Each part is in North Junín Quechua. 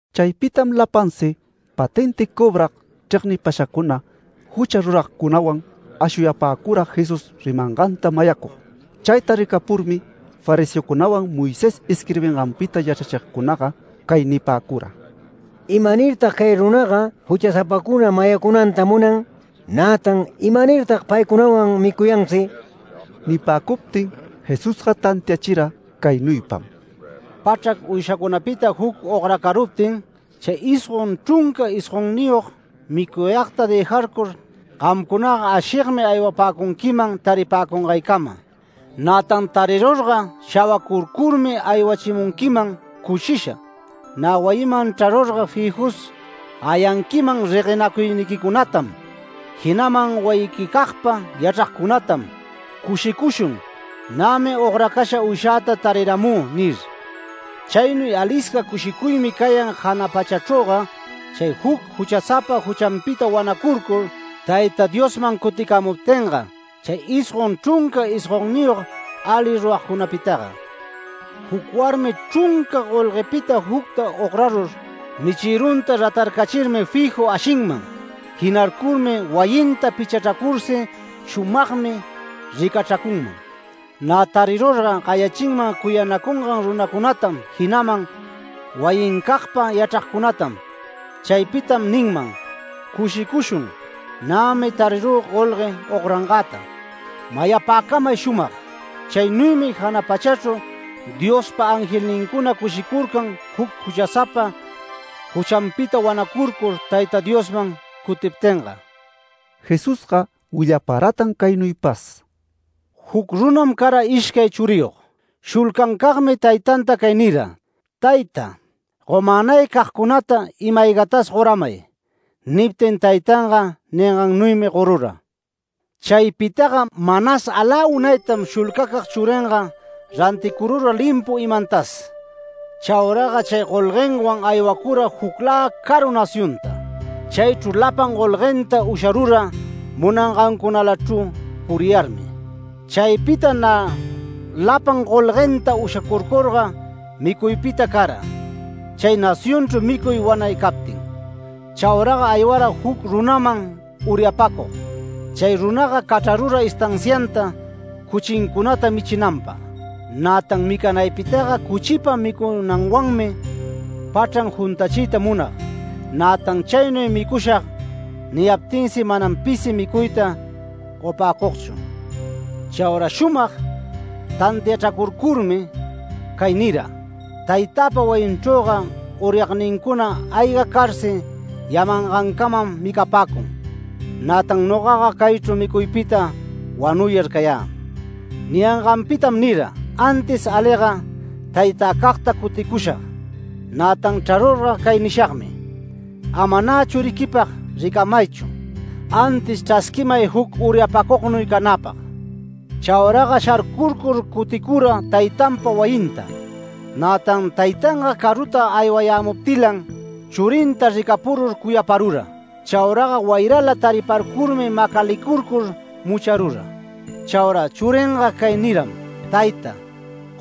Chaypitam lapansi patenti cobrag chregnipashacuna jucha ruragcunawan ashuyapäcura Jesús rimanganta mayacug. Chayta ricapurmi fariseocunawan Moisés isquirbinganpita yachrachigcunaga cay nipäcura: “¿Imanirtag cay runaga juchasapacuna mayacunanta munan? nätan ¿imanirtag paycunawan micuyansi?” Nipäcuptin Jesusga tantiachira caynuypam: “Pachrac uyshaycunapita juc ogracaruptin, chay isgon chrunca isgonniyog micuyagta dëjarcur gamcunaga ashigmi aywapäcunquiman taripäcungaycama. Nätan tarirurga, shawacurcurmi, aywachimunquiman cushisha. Nä wayiman chrarurga fijus gayanquiman reguenacuyniquicunatam, jinaman wayiquicagpa yachragcunatam ‘Cushicushun, nämi ogracasha uyshäta tariramü’ nir. Chaynuy alisca cushicuymi cayan jana pachachrüga chay juc juchasapa juchanpita wanacurcur, Tayta Diosman cuticämuptinga chay isgon chrunca isgonniyog ali ruragcunapitaga”. “Juc warmi chrunca golguenpita jucta ograrur, michïrunta ratarcachirmi fiju ashinman. Jinarcurmi wayinta pichachracursi shumagmi ricachracunman. Nä tarirurga, gayachinman cuyanacungan runacunatam jinaman wayincagpa yachragcunatam. Chaypitam ninman: ‘Cushicushun, nämi tarirü golgue ograngäta’. Mayapäcamay shumag: Chaynuymi jana pachachru Diospa angelnincuna cushicurcan juc juchasapa juchanpita wanacurcur, Tayta Diosman cutiptinga”. Jesusga willaparatan caynuypas: “Juc runam cara ishcay churiyog. Shulcancagmi taytanta cay nira: ‘Tayta, gomänay cagcunata ima-aygatas goramay’. Niptin taytanga ningannuymi gorura. Chaypitaga manas alä unaytam shulcacag churinga ranticurura limpu imantas. Chauraga chay golguenwan aywacura juclä caru nacionta. Chaychru lapan golguenta usharura munangancunalachru puriyarmi. Chaypita nä lapan golguenta ushacurcurga micuypita cara, chay nacionchru micuy wanay captin. Chauraga aywara juc runaman uryapacug. Chay runaga cachrarura estancianta cuchincunata michinanpag. Nätan micanaypitaga cuchipa micunanwanmi pachran juntachiyta munag. Nätan ‘Chaynuy micushag’ niyaptinsi manam pisi micuyta gopäcugchu. Chaura shumag tantiachracurcurmi cay nira: ‘Taytäpa wayinchrüga uryagnincuna ayga carsi yamangancamam micapäcun. Nätan nogaga caychru micuypita wanuyar cayä’. Niyanganpitam nira: ‘Antis aliga taytäcagta cuticushag. Nätan chrarurga, cay nishagmi: Ama nä churiquipag ricamaychu, antis chrasquimay juc uryapacugnuy canäpag’. Chauraga sharcurcur cuticura taytanpa wayinta. Nätan taytanga caruta aywayämuptilan, churinta ricapurur cuyaparura. Chauraga wayrala tariparcurmi macalicurcur mucharura. Chaura churinga cay niram: ‘Tayta,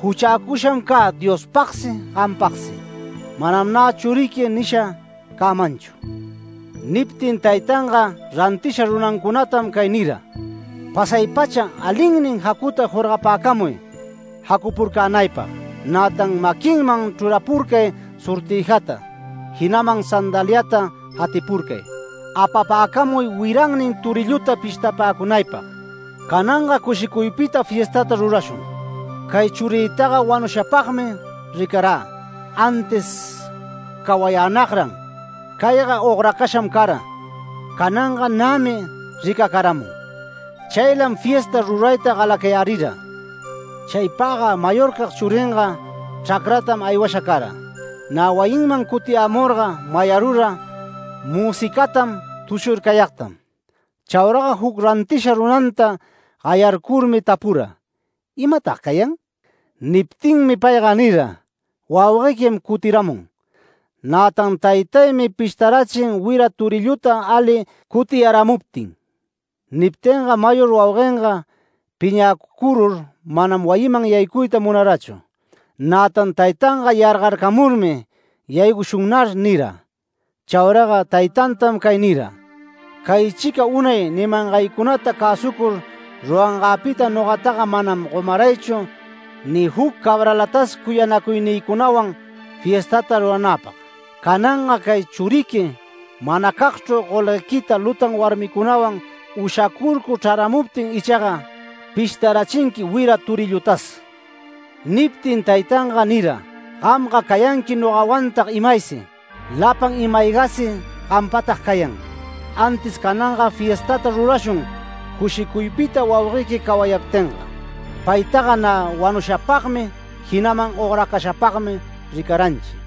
juchäcusham cä Diospagsi, gampagsi. Manam nä churiqui nisha cämanchu’. Niptin taytanga rantisha runancunatam cay nira: ‘Pasay-pacha alinnin jacuta jorgapäcamuy jacupurcänaypag. Nätan maquinman chrurapurcay sortïjata, jinaman sandaliata jatipurcay. Apapäcamuy wirannin torilluta pishtapäcunaypag. Cananga cushicuypita fiestata rurashun. Cay churïtaga wanushapagmi ricarä, antis cawayänagran. Cayga ogracasham cara, cananga nämi ricacaramun. Chaylam fiesta rurayta galacayärira’. Chaypagga mayorcag churinga chracratam aywasha cara. Nä wayinman cutiyämurga, mayarura müsicatam tushurcayagtam. Chauraga juc rantisha runanta gayarcurmi tapura: ‘¿Imatag cayan?’ Niptinmi payga nira: ‘Wauguequim cutiramun. Nätan taytaymi pishtarachin wira torilluta ali cutiyaramuptin’. Niptinga mayor wauguenga piñäcurur manam wayiman yaycuyta munarachu. Nätan taytanga yargarcamurmi ‘Yaycushunnar’ nira. Chauraga taytantam cay nira: ‘Caychica unay nimangaycunata cäsucur rurangäpita, nogataga manam gomaraychu ni juc cabralatas cuyanacuynïcunawan fiestata ruranäpag. Cananga cay churiqui manacagchru golguequita lutan warmicunawan ushacurcur chraramuptin ichaga, pishtarachinqui wira torillutas’. Niptin taytanga nira: ‘Gamga cayanqui nogawantag imaysi. Lapan imä-aygäsi gampatag cayan. Antis cananga fiestata rurashun cushicuypita wauguequi cawayaptinga. Paytaga nä wanushapagmi, jinaman ogracashapagmi ricaranchi’”.